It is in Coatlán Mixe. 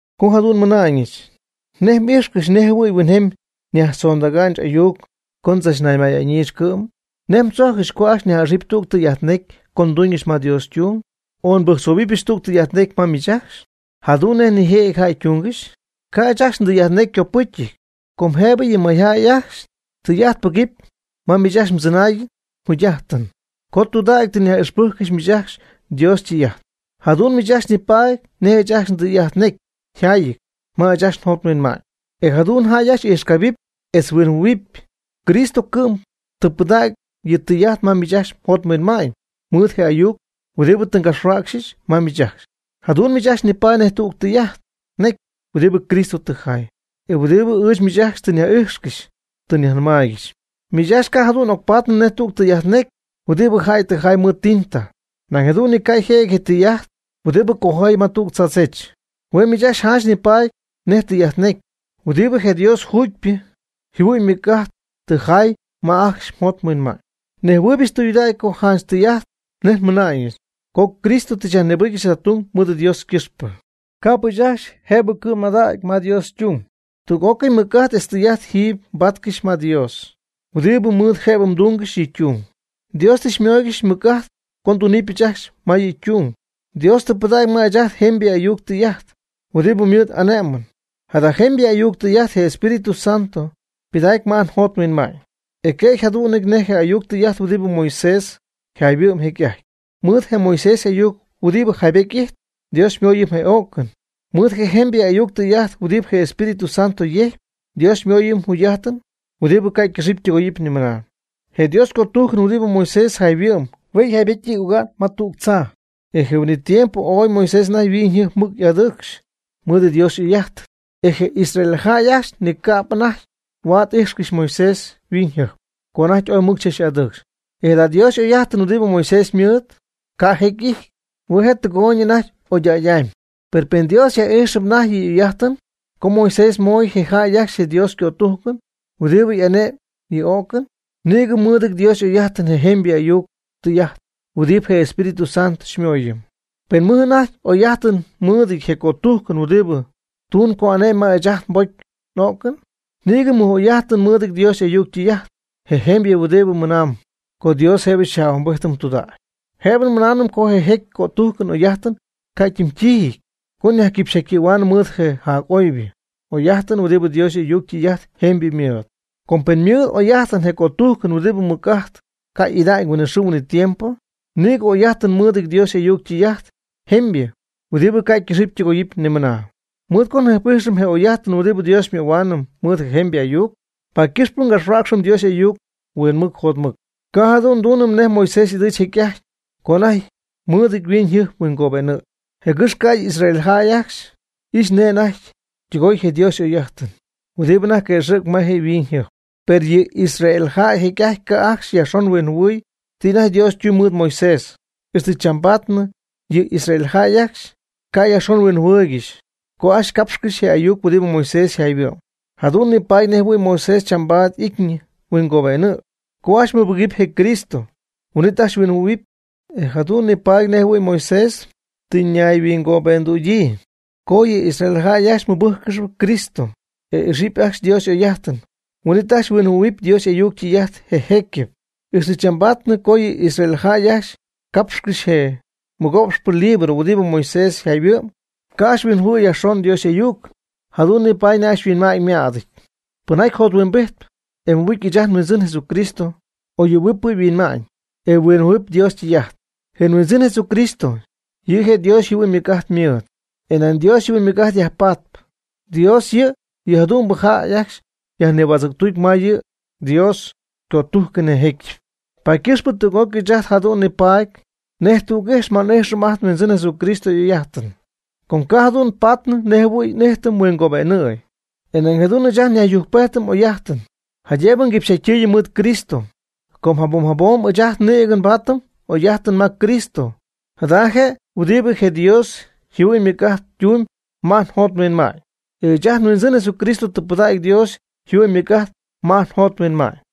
Co jadu'n nmɨna'ñɨch ¿nej m'ijxcɨxy nej jɨhuɨ̈y huinjemy nyajtzondäga'ñɨch ayuc co ndzachnaymayáanɨgɨxyɨch cɨ'm? ¿Nej mdzojccɨx co ajcxy nyaj'ixɨpy tüg tɨy'ajt necy co nduñɨch ma Dios ytung? o ¿Nbɨjctzohuɨpɨch tüg tɨy'ajt necy ma miich ajcxy, jadu'n nej nijëjɨty jäy ytungɨxy? Ca' ɨɨch ajcxy ndɨy'ajt necy ycopɨcyɨty. Com jëbɨ yɨ mayjäy ajcxy tɨy'ajt pɨgɨpy ma miich ajcxy mdzɨnaayɨn mjugy'ajtɨn co tudägy tɨ nyaj'ixpɨcyɨch miich ajcxy Dios ytɨy'ajt. Jadu'n miich ajcxy nipaady nej ɨɨch ajcxy ndɨy'ajt necy yjaayɨty ma ɨɨch ajcxy njot nhuinma'ñ. E jadu'n jäy ajcxy ijxcabɨpy etz huinjɨhuɨ̈huɨpy. Cristo cɨ'm tɨ pɨdägy yɨ' ytɨy'ajt ma miich ajcxy mjot mhuinma'ñ mɨɨd je ayuc huɨdibɨ tɨ ngapxhuäcxyɨch ma miich ajcxy. Jadu'n miich ajcxy nipaady nej tüg tɨy'ajt necy huɨdibɨ Cristo tɨ jaay. E huɨdibɨ ɨɨch miich ajcxy tɨ nyaj'ijxcɨxy tɨ nyajnɨmaaygɨxy. Miich ajcxy ca' jadu'n ocpaatnɨ nej tüg tɨy'ajt necy huɨdibɨ jäy tɨ jay mɨɨd tinta. Nañ jadu'n ni ca' yjëjɨty je tɨy'ajt huɨdibɨ cojayɨp ma tüg tzaadzech. Hue' miich ajcxy janch nipaady nej tɨy'ajt necy huɨdibɨ je Dios jugypɨ yjɨhuɨ'ñ ymɨc'ajt tɨ jaay ma jäy ajcxy yjot yhuinma'ñ. Nejhuɨɨybɨch tɨydudägy co janch tɨy'ajt nej nmɨna'ñɨch co Cristo tɨ xyajnïbɨcyɨch jada tung mɨɨd Dios ycɨxpɨ. Ca'p ɨɨch ajcxy jëbɨ cɨ'm madägy ma Dios ytung. Tüg'ócɨy mɨc'ajt etz tɨy'ajt jiiby nbáatcɨxyɨch ma Dios, huɨdibɨ mɨɨd jëbɨ ndúungɨxɨch yɨ' ytung. Dios tɨ xymóoygɨxyɨch mɨc'ajt co ndunɨpyɨch ajcxy ma yɨ' ytung. Dios tɨ pɨdägy ma ɨɨch ajt jemybɨ ayuc tɨy'ajt, huɨdibɨ mɨɨd xy'ane'mɨm. Jada jemybɨ ayuc tɨy'ajt je Espíritu Santo pɨdaacp ma ajt njot nhuinma'ñ. E ca' je' yjadu'nɨty nej je ayuc tɨy'ajt huɨdibɨ Moisés yjayhuɨ'm jecy'ajty. Mɨɨd je Moisés y'ayuc huɨdibɨ jaybety ijtp, Dios xymooyɨm je o'cɨn. Mɨɨd je jemybɨ ayuc tɨy'ajt huɨdibɨ je Espíritu Santo yejcpy, Dios xymooyɨm jugy'ajtɨn huɨdibɨ ca' ycɨxɨpy ytɨgoyɨpy ni mɨna. Je Dios ycötujcɨn huɨdibɨ Moisés yjayhuɨ'm hue' jaybejty oga'n ma tüg tzaa. E je huin'it tiempo ooy Moisés anajty yhuiñyjɨjp mɨc y'adɨcxy mɨɨd Dios y'oy'ajtɨn. E je Israel jäy ajcxy ni ca'p je' anajty huaad y'ijxcɨxy Moisés yhuiñyjɨjp, co anajty ooy mɨc chach'adɨɨcxy. E jada Dios y'oy'ajtɨn huɨdibɨ Moisés ymɨɨd, ca' jecy y'ijty. Hue' je' tɨgooyñɨp anajty oñydägy'amy. Per pen Dios yaj'ijxɨp anajty yɨ' y'oy'ajtɨn co Moisés moy je jäy ajcxy je Dios ycötujcɨn huɨdibɨ ane'm yɨ o'cɨn, nïgɨ mɨ'idɨpy Dios y'oy'ajtɨn je jemybɨ ayuc tɨy'ajt huɨdibɨ je Espíritu Santo xymooyɨm. Pen mɨj anajty oy'ajtɨn mɨɨdɨty je cötujcɨn huɨdibɨ tuuñ co y'ane'my ma ɨɨch ajt nbocy n'o'cɨn. Nïgɨ mɨj'oy'ajtɨn mɨɨdɨty Dios y'ayuc ytɨy'ajt je jemybɨ huɨdibɨ mɨnaamb co Dios jëbɨ xyaj'ahuimbijtɨm tudägy. Jëbɨ nmɨnaanɨm co je jécyɨp cötujcɨn y'oy'ajtɨn ca' yɨ' ytimytiijɨty co nyajquipxyɨ̈huaanɨm mɨɨd je jac'oybɨ oy'ajtɨn huɨdibɨ Dios y'ayuc ytɨy'ajt jemybɨ ymɨɨd. Com pen ymɨɨd oy'ajtɨn je cötujcɨn huɨdibɨ ymɨc'ajt ca' y'ida'ñ huinɨxɨɨ huinɨtiempo, nïgɨ oy'ajtɨn mɨɨdɨty Dios y'ayuc ytɨy'ajt jemybɨ huɨdibɨ ca' ycɨxɨpy ytɨgoyɨpy nimɨna. Mɨɨd co njɨjp'ijxɨm je oy'ajtɨn huɨdibɨ Dios xymöhuaanɨm mɨɨd je jemybɨ y'ayuc, paady ycɨxp ngapxhuäcxɨm Dios y'ayuc huinmɨc jotmɨc. Ca' jadu'n nduunɨm nej Moisés ɨdɨɨch jecy'ajty co anajty mɨɨdɨty yhuiñyjɨjp huingobe'nɨ̈y, jɨgɨx ca'ydɨ Israel jäy ajcxy ixy nej je' anajty ytɨgoy je Dios y'oy'ajtɨn huɨdibɨ anajty quëxɨ̈cp ma je' yhuiñyjɨjpɨn. Per yɨ Israel jäy jecy'ajty ca' ajcxy yajxon huinjɨhuɨɨy ti anajty Dios ytumyb mɨɨd Moisés, ixtɨ chambaadnɨ yɨ Israel jäy ajcxy ca' yajxon huinjɨhuɨɨygɨxy co ajcxy capxcɨxy je ayuc huɨdibɨ Moisés yjayhuɨ'm. Jadu'n nipaady nejjɨhuɨ̈y Moisés chambaadnɨ y'ityñɨ huingobe'nɨ̈y. Co ajcxy mɨbɨgɨpy je Cristo, huin'it ajcxy huinjɨhuɨ̈huɨpy, e jadu'n je' paadɨpy nej jɨhuɨ̈y Moisés tɨ ñayhuingobe'ndüdyii. Co yɨ Israel jäy ajcxy mɨbɨ́jccɨxɨpy Cristo, e ijxɨp ajcxy Dios y'oy'ajtɨn, huin'itnɨ ajcxy huinjɨhuɨ̈huɨpy Dios y'ayuc ytɨy'ajt je jécyɨp. Ixtɨ chambaadnɨ co yɨ Israel jäy ajcxy capxcɨxy je mɨgooxpɨ libro huɨdibɨ Moisés yjayhuɨ'm, ca' ajcxy huinjɨhuɨɨyɨ yajxon Dios y'ayuc, jadu'n nipaady nej ajcxy yhuinma'ñ ymädɨty. Pɨnjaty jothuimbijtp, e mɨbɨcy ɨɨch ajt nHuindzɨn Jesucristo, oyɨɨyñɨp yɨ' yhuinma'ñ, e yhuinjɨhuɨ̈huɨpy Dios ytɨy'ajt. Je Huindzɨn Jesucristo, yɨ' je' Dios yjɨhuɨ'ñ ymɨc'ajt ymɨɨd. E ma Dios yjɨhuɨ'ñ ymɨc'ajt yajpaady, Dios yɨ' yɨ jadu'mbɨ jäy ajcxy yajnihuätzɨ̈ctutp ma yɨ Dios ycötujcɨn je jécyɨp. Paady ycɨxp tüg'ócɨy ɨɨch ajt jadu'n nipaady nej tüg ijx ma nni'ijxɨm ajt nHuindzɨn Jesucristo y'oy'ajtɨn. Com ca' jadu'n patnɨ nej jɨhuɨ̈y n'ijtɨm huingobe'nɨ̈y. E nañ jadu'n ɨɨch ajt njacyujcpejtɨm n'oy'ajtɨn, jaydëbɨ nguipxyjatytɨɨyɨm mɨɨd Cristo. Com jabom jabom ɨɨch ajt nïgɨ nbaatɨm n'oy'ajtɨn ma Cristo. Jada je' huɨdibɨ je Dios yjɨhuɨ'ñ ymɨc'ajt ytumyb ma ajt njot nhuinma'ñ. E ɨɨch ajt nHuindzɨn Jesucristo tɨ pɨdägy Dios yjɨhuɨ'ñ ymɨc'ajt ma ajt njot nhuinma'ñ.